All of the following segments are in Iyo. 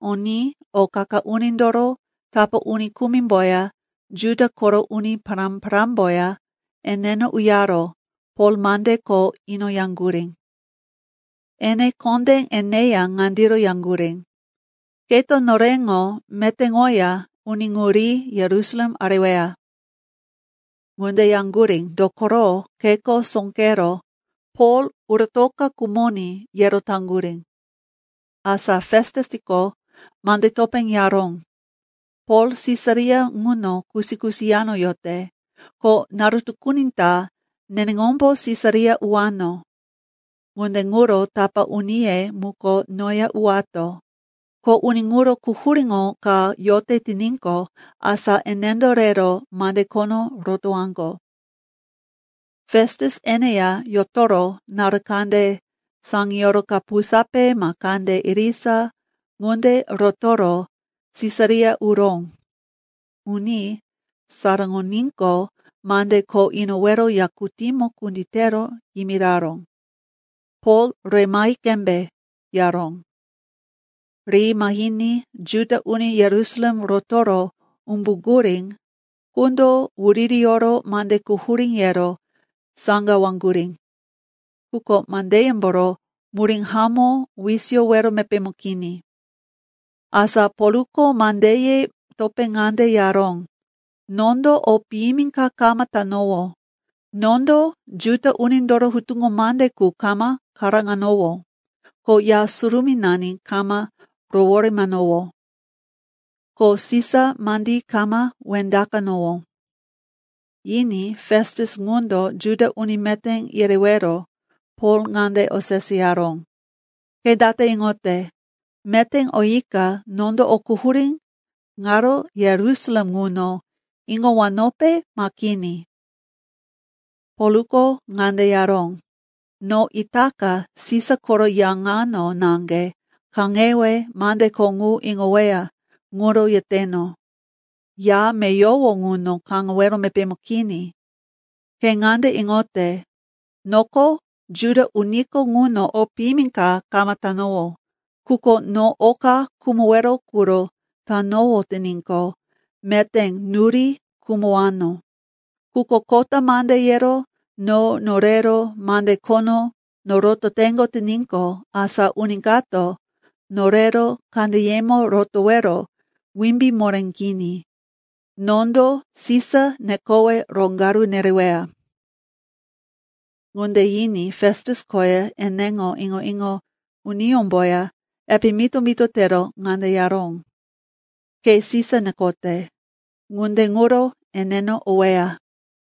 Oní o qa-qa unindoro tapá uni kumimboya Juda koro uni pará-parámboya eneno uyaro Pol mande kho inoyaŋgurí. Ene kondé eneya ŋandiro yaŋgurí, “Keto noreŋo metéŋoya uni ŋu ri Yerusalem areweya.” Ŋunde yaŋgurí, dokoro kheko sóqero, Pol uratoka khumoní, yero taŋgurí. Asa Festusko mande topé yaró, “Pol Sisaria ŋuno kusi-kusi yano yote, ko naru tukuni ta neneŋombo Sisaria uwano. Ŋunde ŋuro tapá uniye muko noya uwato. Ko uni ŋuro quhuríŋo ka yote tiníqo, asa enendo rero mande khono rotowaŋgo.” Festus eneya yotoro naru kande saŋiyoro kapusape ma kande irisa ŋunde rotoro Sisaria uró. Uní saraŋoníqo, mande kho inowero yakutímo kunditero yimiraró, Pol re mahi qembe, yaró. Ri mahiní Juda uni Yerusalem rotoro umbuŋgurí qundo wuririyoro mande quhurí yero saŋgawaŋgurí. Quko mandeyemboro murí hamó wisiyowero mepémo kini. Asa Polko mandeye topé ŋande yaró, “Nondo o piyimi ka kama tanowó. Nondo Juda unindoro hutuŋo mande qu kama karóŋanowó, ko Ya Surumínani kama roworemanowó, ko Sisa mandí kama wendaqanowó.” Yiní Festus ŋundo Juda uni meté yerewero Pol ŋande oseseyaró, “Ke date iŋote, meté oyika nondo o quhurí ŋaro Yerusalem ŋuno iŋowanope ma kini?” Polko ŋande yaró, “No itaka Sisa koro ya ŋano naŋge kaŋewe mande kho ŋu iŋoweya ŋuro yeteno. Ya meyowo ŋuno kaŋewero mepémo kini. Ke ŋande iŋote, noko Juda uniko ŋuno o piyimi ka kama tanowó. Quko no oka khumowero quro tanowó tiníqo, meté nuri khumowano. Quko kota mande yero no norero mande khono norototeŋgo tiníqo, asa uni kato norero kandeyemo rotowero wimbí moré kini. Nondo Sisa nekowe roŋgaru nereweya.” Ŋunde yiní Festus koya eneŋo iŋo-iŋo uniyómboya epe mito-mito tero ŋande yaró, “Ke Sisa nekote. Ŋunde ŋuro eneno oweya.”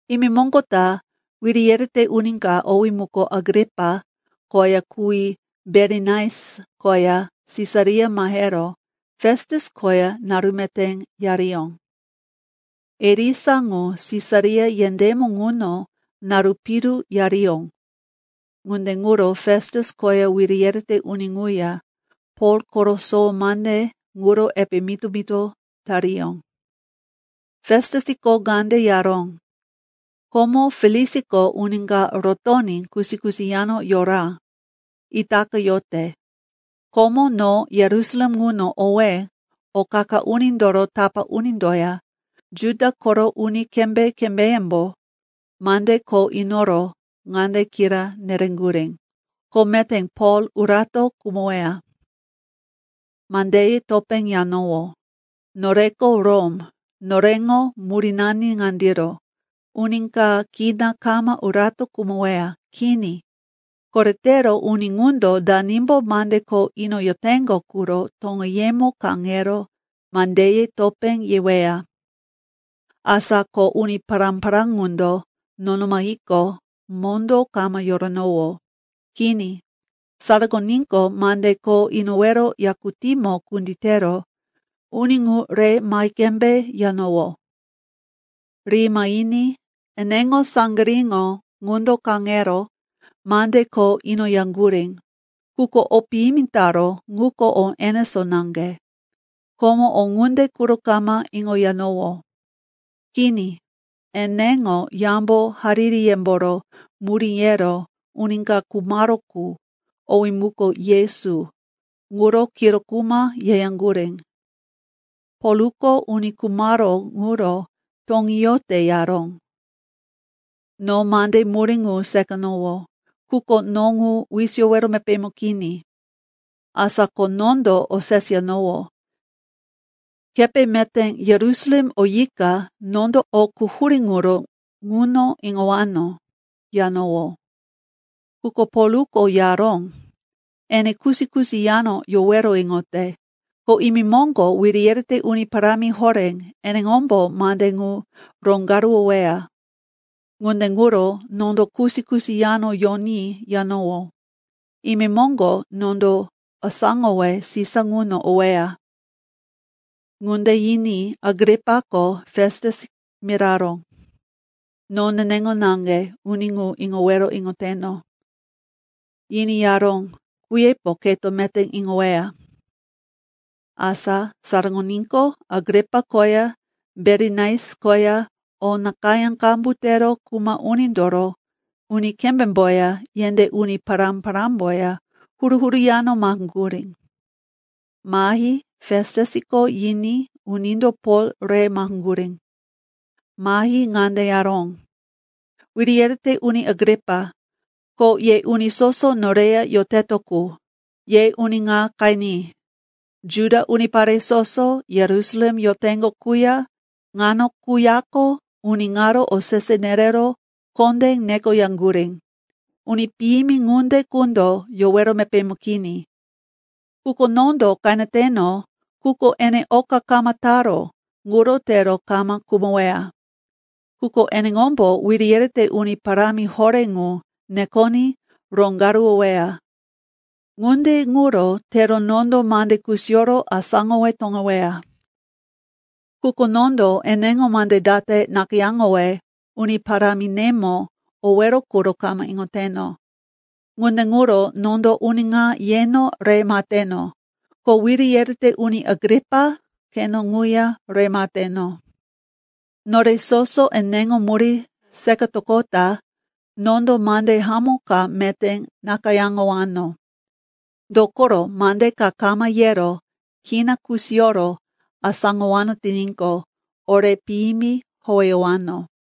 Imemoŋgo ta wiri yerete uni ka, owí muko Agripa, koya kuwí Berinais koya Sisaria mahero Festus koya naru meté yariyó. Irisa ŋu Sisaria yendémo ŋuno naru piru yariyó, ŋunde ŋuro Festus koya wiri yerete uni ŋuya Pol koro sowo mande ŋuro epe mito-mito tariyó. Festusko ŋande yaró, “Komo Feliksiko uni ka rotoní kusi-kusi yano yora. Itaka yote. Komo no Yerusalem ŋuno owé o qa-qa unindoro tapá unindoya Juda koro uni kembé-kembéyembo mande kho inoro ŋande kira nereŋgurí, ko meté Pol urato khumoweya. “Mandeye topé yanowó, ‘Noreko Rom, noreŋo murínani ŋandiro, uni ka kina kama urato khumoweya. Kini, koretero uni ŋundo danimbo mande kho inoyoteŋgo quro toŋeyemo kaŋero mandeye topé yeweya.’ Asa ko uni pará-pará ŋundo nono mahiqo, mondó kama yoranowó. Kini, saraŋoníqo mande kho inowero yakutímo kunditero uni ŋu re mahi qembe yanowó. Ri mahiní eneŋo saŋgiríŋo ŋundo kaŋero mande kho inoyaŋgurí, quko o piyimi taró ŋuko o enesó naŋge. Komo o ŋunde quro kama iŋoyanowó. Kini, eneŋo yambo haririyemboro murí yero uni ka khumaró qu, owí muko Yesu, ŋuro kiro kuma yeyaŋgurí. Polko uni khumaró ŋuro, toŋí yote, yaró. No mande murí ŋu seqanowó, quko no ŋu wisiyowero mepémo kini. Asa ko nondo oseseyanowó, ‘Kepe meté Yerusalem oyika nondo o quhurí ŋuro ŋuno iŋowano?’ yanowó. Quko Polko yaró, ene kusi-kusi yano yowero iŋote, ko imemoŋgo wiri yerete uni parámi horé eneŋombo mande ŋu roŋgaruwoweya. Ŋunde ŋuro nondo kusi-kusi yano yoní yanowó, imemoŋgo nondo asáŋowe Sisa ŋuno oweya.” Ŋunde yiní Agripako Festus miraró, “No neneŋo naŋge uni ŋu iŋowero iŋoteno.” Yiní yaró, “Kuyepo keto meté iŋoweya.” Asa saraŋoníqo, Agripa koya Berinais koya o nakayá qambu tero kuma unindoro uni kembémboya yendé uni pará-parámboya huru-huru yano maheŋgurí. Mahi Festusko yiní unindo Pol re maheŋgurí. Mahi ŋande yaró, “Wiri yerete Uni Agripa, ko ye uni soso noreya yoteto qu, ye uni ŋa qeni. Juda unipare soso, Yerusalem yoteŋgo quya ŋano quyako uni ŋaro osese nerero kondé nekoyaŋgurí, ‘Uni piyimi ŋunde qundo yowero mepémo kini.’ Quko nondo qeneteno quko ene oka kama taró ŋuro tero kama khumoweya. Quko eneŋombo wiri yerete uni parámi horé ŋu nekoní roŋgaruwoweya. Ŋunde ŋuro tero nondo mande kusiyoro asáŋowe toŋeweya. Quko nondo eneŋo mande date nakayáŋowe uni paráminemo owero quro kama iŋoteno. Ŋunde ŋuro, nondo uni ŋa yeno re maheteno, ko Wiri yerete Uni Agripa, keno ŋuya re maheteno. Nore soso eneŋo murí seqatoqota nondo mande hamó ka meté nakayáŋowano. Dokoro mande ka kama yero kina kusiyoro asáŋowano tiníqo, ore piyimi howeyowano.”